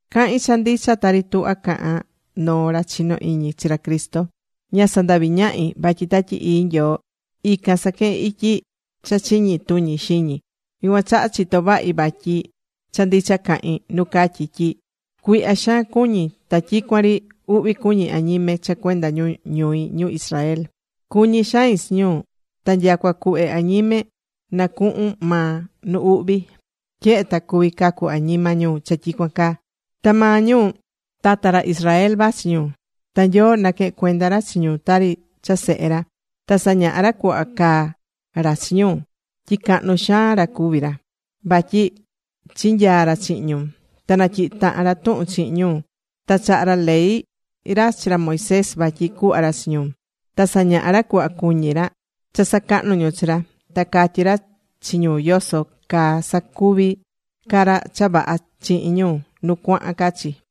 Cahín cha ndicha, tari tuhvá cahán noo ra chinó iñi chi ra Cristo. Ña sandaví ñahi, vatyi Tatyi Ii Nyoo ican saquehén ityi cha chiñi tuñi xiñi. Yucuan chaha chitó vahi vatyi cha ndicha cahín nu catyí tyi cuihya xaan cuñí ta tyicuan ri uhvi cuñí añime cha cuenda ñu ñui ñu Israel. Cuñí xain chi ñu. Ta nyacua cuhve añime na cuhun maa nu uhvi, tyehe ta cuví cacu añima ñu cha tyicuan caa. Ta maa ñu, tata ra Israel vachi ñu. Ta Nyoo naquehe̱n cuenda ra chi ñu tari cha sehe ra. Ta sañaha̱ ra cuhva caá ra chi ñu, tyi cahnu xaan ra cuví ra, vatyi chinyaa̱ ra chihin ñu. Ta natyihi̱ tahan ra tuhun chihin ñu, ta chaha̱ ra ley ra chi ra Moisés vatyi cuhva ra chi ñu. Ta sañaha̱ ra cuhva cuñí ra cha sacahnú ñu chi ra. Ta catyí ra chi ñu yoso caa cusacuvi ca ra cha vaha chihin ñu nu cuahan ca chi.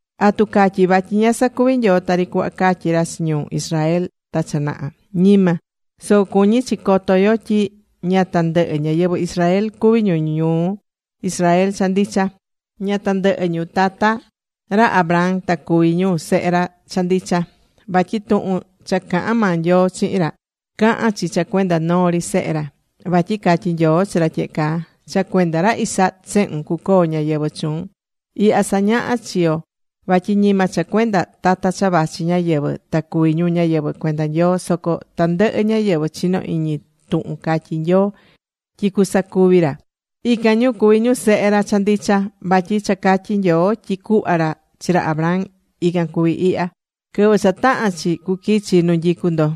¿Atu catyí vatyi ña sacuvi̱ Nyoo tari cuhva catyi̱ ra chi ñu Israel ta cha naha? Ñima. Soco cuñí chi coto yo tyi ña tandɨhɨ ñáyɨvɨ Israel cuví ñu ñu Israel cha ndicha. Ña tandɨhɨ ñu tata ra Abraham ta cuví ñu sehe ra cha ndicha. Vatyi tuhun cha caha̱n maa Nyoo chihin ra, cahán chi cha cuenda noo ri sehe ra. Vatyi catyi̱ Nyoo chi ra tyehe caa: “Cha cuenda ra Isaac sehun cucoo ñáyɨvɨ chuun.” Ihya sañahá chi yo vatyi ñima cha cuenda tata cha vachi ñáyɨvɨ ta cuví ñu ñáyɨvɨ cuenda Nyoo. Soco tandɨhɨ ñáyɨvɨ chinó iñi tuhun catyí Nyoo tyi cusacuvi ra, ican ñu cuví ñu sehe ra cha ndicha. Vatyi cha catyi̱ Nyoo tyi cuhva ra chi ra Abraham, ican cuví ihya: “Quɨvɨ cha tahán chi, cuquichi nu nyicú ndo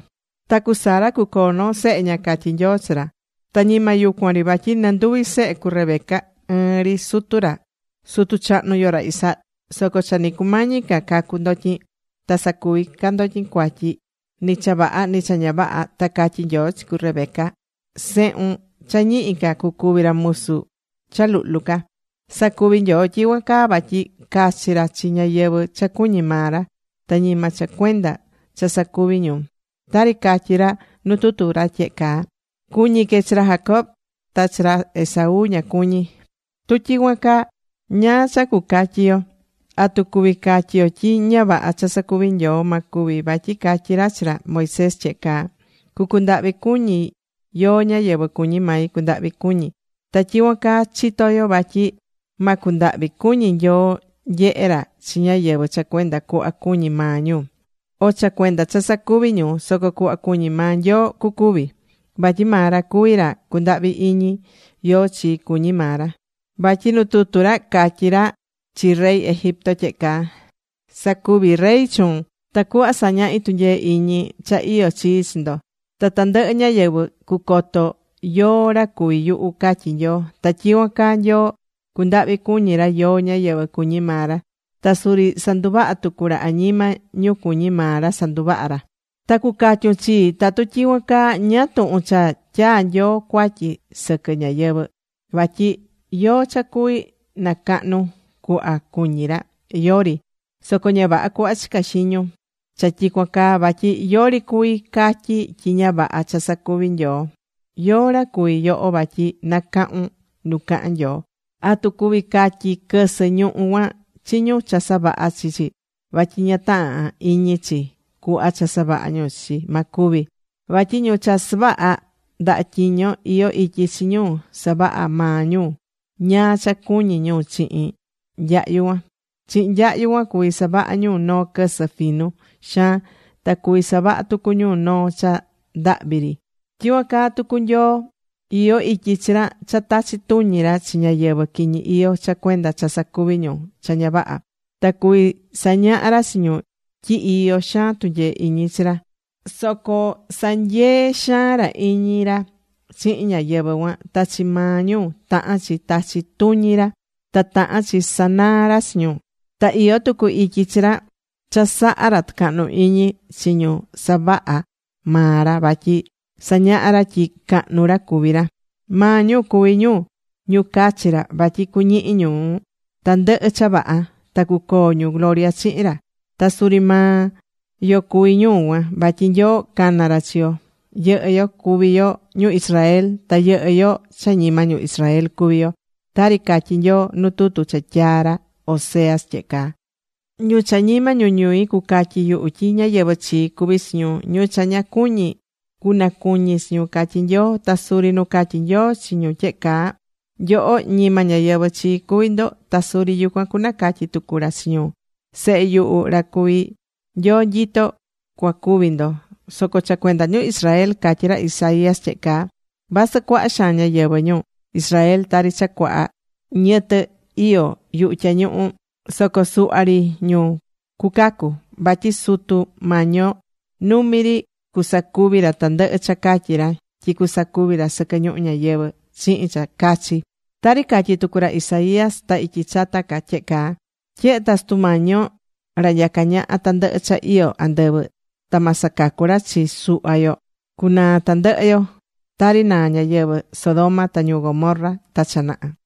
ta cu Sara cucoo noo sehe ña”, catyi Nyoo chi ra. Ta ñima yucuan ri. Vatyi nɨ nduvi sehe cu Rebeca, ɨɨn ri sutu ra, sutu chahnu yo, ra Isaac. Soco cha ni cumañi ca cacu ndotyin, ta sacuvi ca ndotyin ni cha vaha, ni cha ña vaha, ta catyi̱ Nyoo chi cu Rebeca: “Sehun cha ñihi ca cucuvi ra musu ra cha luhlu ca.” Sacuvi̱ Nyoo tyicuan caa vatyi cachí ra chi ñáyɨvɨ cha cuñí maa ra, ta ñima cha cuenda cha sacuvi ñu. Tari catyí ra nu tutu ra tyehe caa: “Cuñí que chi ra Jacob, ta chi ra Esaú ña cuñí.” ¿Tu tyicuan caa ñáá cha cucatyi yo? ¿Atu cuví catyi yo tyi ña vaha cha sacuví Nyoo? ¡Ma cuvi! Vatyi catyí ra chi ra Moisés tyehe caa: “Cu cundahvi cuñi yóó ñáyɨvɨ cuñí mai cundahvi cuñi.” Ta tyicuan caa chitó yo vatyi ma cundahvi cuñi Nyoo nyehe ra chi ñáyɨvɨ cha cuenda cuhva cuñí maa ñu, o cha cuenda cha sacuvi̱ ñu. Soco cuhva cuñí maa Nyoo cucuvi. Vatyi maa ra cuví ra cundahvi iñi yóó chi cuñí maa ra. Vatyi nu tutu ra, catyi̱ ra chi rey Egipto tyehe caa: “Sacuví rey chuun tacuhva sañahí tunyee iñi cha iyó chii chi ndo, ta tandɨhɨ ñáyɨvɨ cucoto ñu yóó ra cuví yuhu”, catyí Nyoo. Ta tyicuan caa Nyoo cundahvi cuñí ra yóó ñáyɨvɨ cuñí maa ra. Ta suri sandundavá tucu ra añima ñu cuñí maa ra sandundava ra. Ta cu catyun chii: “Tatu tyicuan caa, ¿ñáá tuhun cha tyaa̱ Nyoo cuatyi sɨquɨ ñáyɨvɨ? Vatyi ¿yóó cha cuví nacahnu cuhva cuñí ra? ¡Yori!” Soco ña vaha cuhva chicá iñun cha tyicuan caa. Vatyi yori cuví catyi tyi ña vaha cha sacuví Nyoo. ¿Yóó ra cuví yoho vatyi nacahun nu cahán Nyoo? ¿Atu cuví catyi quɨsɨ ñuhú cuan chi ñu cha savaha̱ chi chi vatyi ña tahán iñi chi cuhva cha savaha̱ ñu chi chi? Ma cuvi. Vatyi ñu cha savahá ndaha tyiño iyó ityi chi ñu savahá maa ñu ñáá cha cuñí ñu chihin nyahyu cuan. Chihin nyahyu cuan cuví savaha ñu noo quɨsɨ finu xaan. Ta cuví savaha tucu ñu noo cha ndahvi ri. Tyicuan caa tucu Nyoo, iyó ityi chi ra cha tachi tuñi ra chi ñáyɨvɨ quiñi iyó cha cuenda cha sacuví ñu cha ña vaha. Ta cuví sañaha ra chi ñu tyi iyó xaan tunyee iñi chi ra. Soco sanyee̱ xaan ra iñi ra chihin ñáyɨvɨ cuan. Ta chi maa ñu tahán chi tachi tuñi ra. Ta tahán chi sanaa ra chi ñu. Ta iyó tucu ityi chi ra cha saha̱ ra tucahnu iñi chi ñu savaha̱ maa ra vatyi sañahá ra tyi cahnu ra cuví ra. Maa ñu cuví ñu ñu cachi̱ ra vatyi cuñihi ñu tandɨhɨ cha vaha, ta cucoo ñu gloria chihin ra. Ta suri maa yo cuví ñu cuan. Vatyi Nyoo cana̱ ra chi yo. Yɨhɨ́ yo cuví yo ñu Israel, ta yɨhɨ́ yo cha ñima ñu Israel cuví yo. Tari catyí Nyoo nu tutu cha tyaa̱ ra Oseas tyehe caa: Ñu cha ñima ñu ñui cucatyi yuhu tyi ñáyɨvɨ chii cuví chi ñu. Ñu cha ña cuñi̱, cunacuñi chi ñu, catyí Nyoo. Ta suri nu catyi̱ Nyoo chi ñu tyehe caa: “Nyoho ñima ñáyɨvɨ chii cuví ndo.” Ta suri yucuan cunacatyi tucu ra chi ñu: “Sehe yuhu, ra cuví Nyoo nyito, cuacuvi ndo.” Soco cha cuenda ñu Israel catyí ra Isaías tyehe caa: “Vasɨ cuaha xaan ñáyɨvɨ ñu Israel tari cha cuaha niyɨtɨ iyó yuhu tyañuhu, soco suhva ri ñu cucacu. Vatyi Sutu Mañi yo numi ri cusacuvi ra tandɨhɨ cha catyi̱ ra tyi cusacuvi ra sɨquɨ ñuhu ñayɨvɨ̱ chihin cha cachi.” Tari catyi̱ tucu ra Isaías ta ityi chata ca tyehe caa: Tyehe ta Sutu Mañi yo ra nyacá ñaha tandɨhɨ cha iyó andɨvɨ, ta ma sacacu ra chi suhva yo, cunaa tandɨhɨ yo, Tari naa̱ ñáyɨvɨ Sodoma ta ñu Gomorra ta cha naha.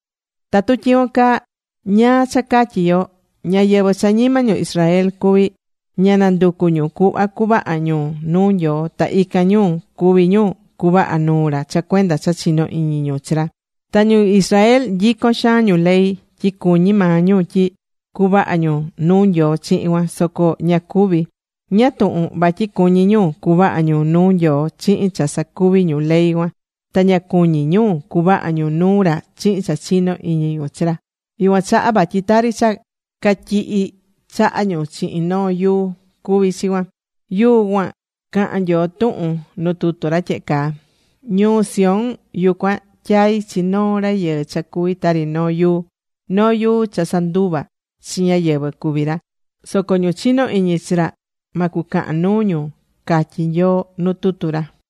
¿Tatu tyicuan caa, ñáá cha catyí yo? Ñáyɨvɨ cha ñima ñu Israel cuví, ña nanducu̱ ñu cuhva cuvaha ñu nuu Nyoo, ta ican ñu cuví ñu cuvahá nuu ra cha cuenda cha chinó iñi ñu chi ra. Ta ñu Israel nyicón xaan ñu ley, tyi cuñí maa ñu tyi cuvaha ñu nuu Nyoo chihin cuan, soco ña cuvi̱. ¿Ñáá tuhun? Vatyi cuñí ñu cuvaha ñu nuu Nyoo chihin cha sacuví ñu ley cuan, ta ña cuñí ñu cuvaha ñu nuu ra chihin cha chinó iñi ñu chi ra. Yucuan chaha vatyi tari cha catyihí chaha ñu chihin noo yuu cuví chi cuan. Yuu cuan cahán Nyoo tuhun nu tutu ra tyehe caa: Ñuu Sión, yucuan tyai̱ chi noo rayɨɨ cha cuví tari noo yuu. Noo yuu cha sanduvá chi ñáyɨvɨ cuví ra. Soco ñu chinó iñi chi ra ma cucahan nuu ñu, catyí Nyoo nu tutu ra.